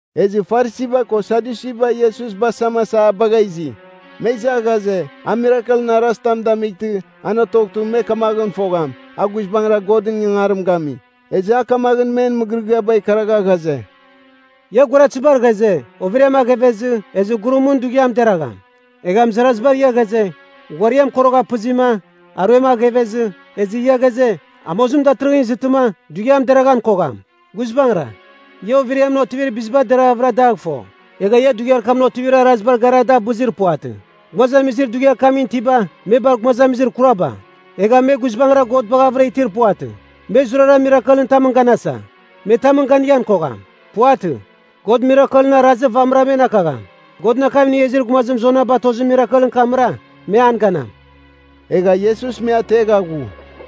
Ezɨ Farisiba ko Sadyusiba Iesus basamasa a bagha izi. Me iza ghaze, a mirakelɨn arazitam damightɨ, an otoghtɨ me kamaghɨn fogham, a guizbangɨra Godɨn ingangarim gami. Ezɨ a kamaghɨn men mɨgɨrɨgɨaba ikaragha ghaze, “Ia guaratɨzibar ghaze, overiam aghevezɨ, ezɨ gurumɨn dughiam deragham. Egha mɨzarazibar ia ghaze, ghuariam korogha pɨzɨma, aruem aghevezɨ, ezɨ ia ghaze, amozim datɨrɨghɨn izɨtɨma, dughiam deraghan kogham. Guizbangɨra, ia overiamɨn otivir biziba deravɨra dagh fo. Egha ia dughiar kamɨn otivir arazibar gara da abɨzir puvatɨ. Gumazamizir dughiar kamɨn itiba, me bar gumazamizir kuraba! Egha me guizbangɨra God baghavɨra itir puvatɨ. Me zurara mirakelɨn tamɨn ganasa. Me tamɨn ganighan kogham. Puvatɨ. God mirakelɨn arazir vamɨra men akagham. Godɨn akam inigha izir gumazim Jona batozir mirakelɨn kamra, me an ganam.” Egha Iesus me ategha ghu.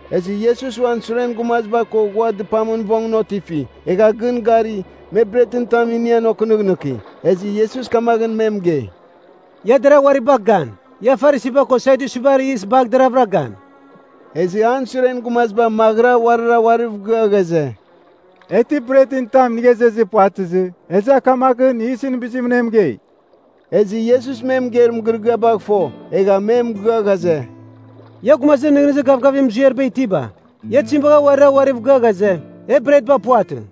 Ezɨ Iesus uan suren gumaziba ko ghua dɨpamɨn vongɨn otifi, egha gɨn gari, me bretɨn tam inian okɨnɨghnɨki. Ezɨ Iesus kamaghɨn me mɨgei, “Ia deragh uari bagh gan. Ia Farisiba ko Sadyusibar yis bagh deravɨra gan.” Ezɨ an suren gumaziba maghɨra uarira uariv gɨa ghaze, “E ti bretɨn tam inigha izezir puvatɨzɨ, ezɨ a kamaghɨn yisɨn bizimɨn e mɨgei.” Ezɨ Iesus me mɨgeir mɨgɨrɨgɨabagh fo, egha me mɨgɨa ghaze, “Ia gumazir nɨghnɨzir gavgavir muziariba itiba! Ia tizim bagha uarira uariv gɨa ghaze, e bretba puvatɨ?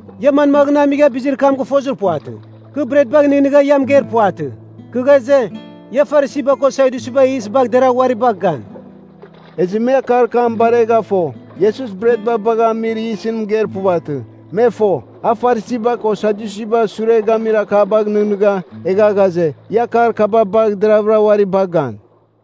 Ia manmaghɨn amigha bizir kam gɨfozir puvatɨ, kɨ bretbagh nɨghnɨgha ia mɨgeir puvatɨ? Kɨ ghaze, ia Farisiba ko Sadyusibar yis bagh deragh uari bagh gan.” Ezɨ me akar kam baregha fo, Iesus bret bagha amir yisɨn mɨgeir puvatɨ. Me fo, a Farisiba ko Sadyusiba sure gamir akabagh nɨghnɨgha, egha ghaze, ia akar kaba bagh deravɨra uari bagh gan.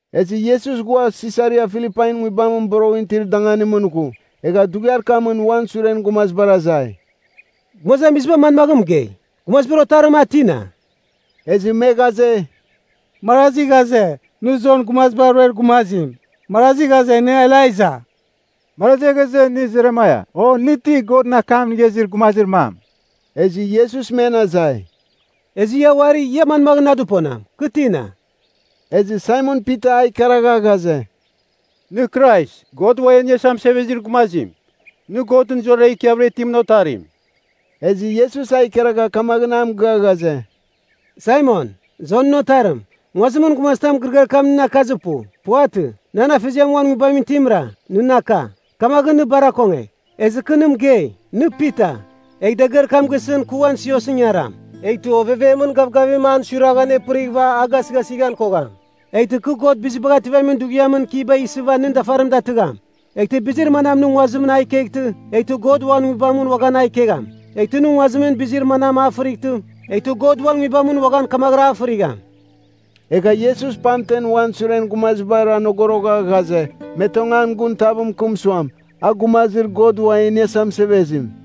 Ezɨ Iesus ghua Sisaria Filipain nguibamɨn boroghɨn itir danganimɨn ghu, egha dughiar kamɨn uan suren gumazibar azai, “Gumazamiziba manmaghɨn mɨgei, Gumazibar Otarim a tina?” Ezɨ me ghaze, “Marazi ghaze, nɨ Jon Gumaziba Ruer Gumazim, marazi ghaze nɨ Elaija, marazi ghaze nɨ Jeremaia, o nɨ ti Godɨn akam inigha izir gumazir mam.” Ezɨ Iesus men azai, “Ezɨ ia uari, ia manmaghɨn na dɨponam? Kɨ tina?” Ezɨ Saimon Pita a ikaragha ghaze, “Nɨ Krais, God Ua E Iniasa Mɨsevezir Gumazim. Nɨ Godɨn zurara ikiavɨra itimɨn Otarim.” Ezɨ Iesus a ikaragha kamaghɨn a mɨgɨa ghaze, “Saimon, Jonɨn otarim, nguazimɨn gumazitam mɨgɨrɨgɨar kam nɨn akazir pu. Puvatɨ. Nan Afeziar uan Nguibamɨn itimra, nɨn aka. Kamaghɨn nɨ bar akongegh. Ezɨ kɨ nɨ mɨgei, nɨ Pita. Egh dagɨar kam gisɨn kɨ uan siosɨn ingaram, eghtɨ Ovevemɨn Gavgavim an suiragh anepɨrighɨva a gasɨghasighan kogham. Eghtɨ kɨ God Bizibagh Ativamin Dughiamɨn kiba isɨva nɨn dafarim datɨgham. Eghtɨ bizir manam nɨ nguazimɨn a ikeghtɨ, eghtɨ God uan Nguibamɨn uaghan a ikegham. Eghtɨ nɨ nguazimɨn bizir manam a fɨrightɨ, eghtɨ God uan Nguibamɨn uaghan kamaghɨra a fɨrigham. Egha Iesus pamten uan suren gumaziba anogorogha ghaze, me tong an gun tav mɨkɨm suam, a Gumazir God Uam E Iniasa Mɨsevezim.”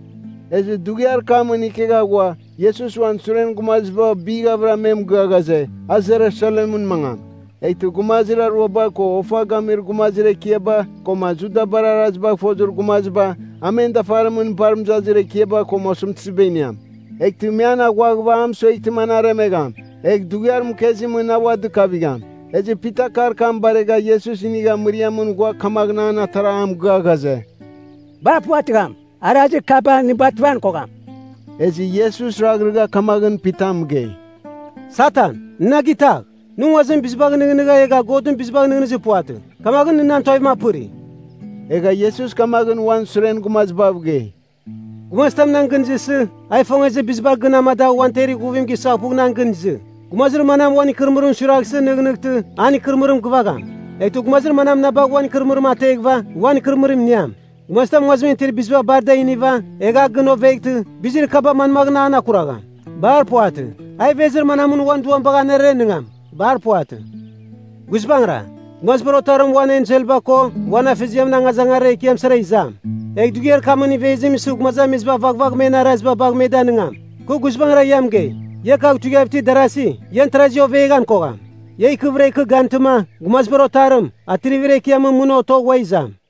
Ezɨ dughiar kamɨn ikegha ghua, Iesus uan suren gumaziba bighavɨra me mɨgɨa ghaze, a Jerusalemɨn mangam, eghtɨ gumazir aruaba, ko ofa gamir gumazir ekiaba, koma Judabar arazibagh fozir gumaziba, a men dafarimɨn bar mɨzazir ekiaba koma osɨmtɨziba iniam. Eghtɨ me an aghuaghɨva a mɨsueghtɨma an aremegham. Egh dughiar mɨkezimɨn a ua dɨkavigham. Ezɨ Pita akar kam baregha Iesus inigha mɨriamɨn ghua kamaghɨn an atara a mɨgɨa ghaze, “Bar puvɨratɨgham. Arazir kaba nɨ bativan kogham.” Ezɨ Iesus raghrɨgha kamaghɨn Pita mɨgei, “Satan, nɨ na gitagh! Nɨ nguazimɨn bizibagh nɨghnɨgha egha Godɨn bizibagh nɨghnɨzir puvatɨ, kamaghɨn nɨ nan tuavim apɨri.” Egha Iesus kamaghɨn uan suren gumazibav gei, “Gumazitam nan gɨn izɨsɨ, a ifongezir biziba gɨn amadagh uan temer ighuvim gisaghpugh nan gɨn izɨ. Gumazir manam uan ikɨrɨmɨrim suiraghsɨ nɨghnɨghtɨ, an ikɨrɨmɨrim gɨvagham. Eghtɨ gumazir manam na bagh uan ikɨrɨmɨrim ateghɨva, uan ikɨrɨmɨrim iniam. Gumazitam nguazimɨn itir biziba bar da iniva, egh a gɨn oveghtɨ, bizir kaba manmaghɨn an akuragham? Bar puvatɨ. A ivezir manamɨn uan duam bagh anerenɨngam? Bar puvatɨ. Guizbangɨra, Gumazibar Otarim uan enselba ko, uan Afeziamɨn angazangarir ekiam sara izam. Egh dughiar kamɨn ivezim isɨ gumazamiziba vaghvagh men araziba bagh me danɨngam. Kɨ guizbangɨra ia mɨgei, ia kagh tuivighav itir darasi, ian tarazi oveghan kogham. Ia ikɨvɨra ikɨ gantɨma, Gumazibar Otarim, Atrivir Ekiamɨn mɨn otogh ua izam.”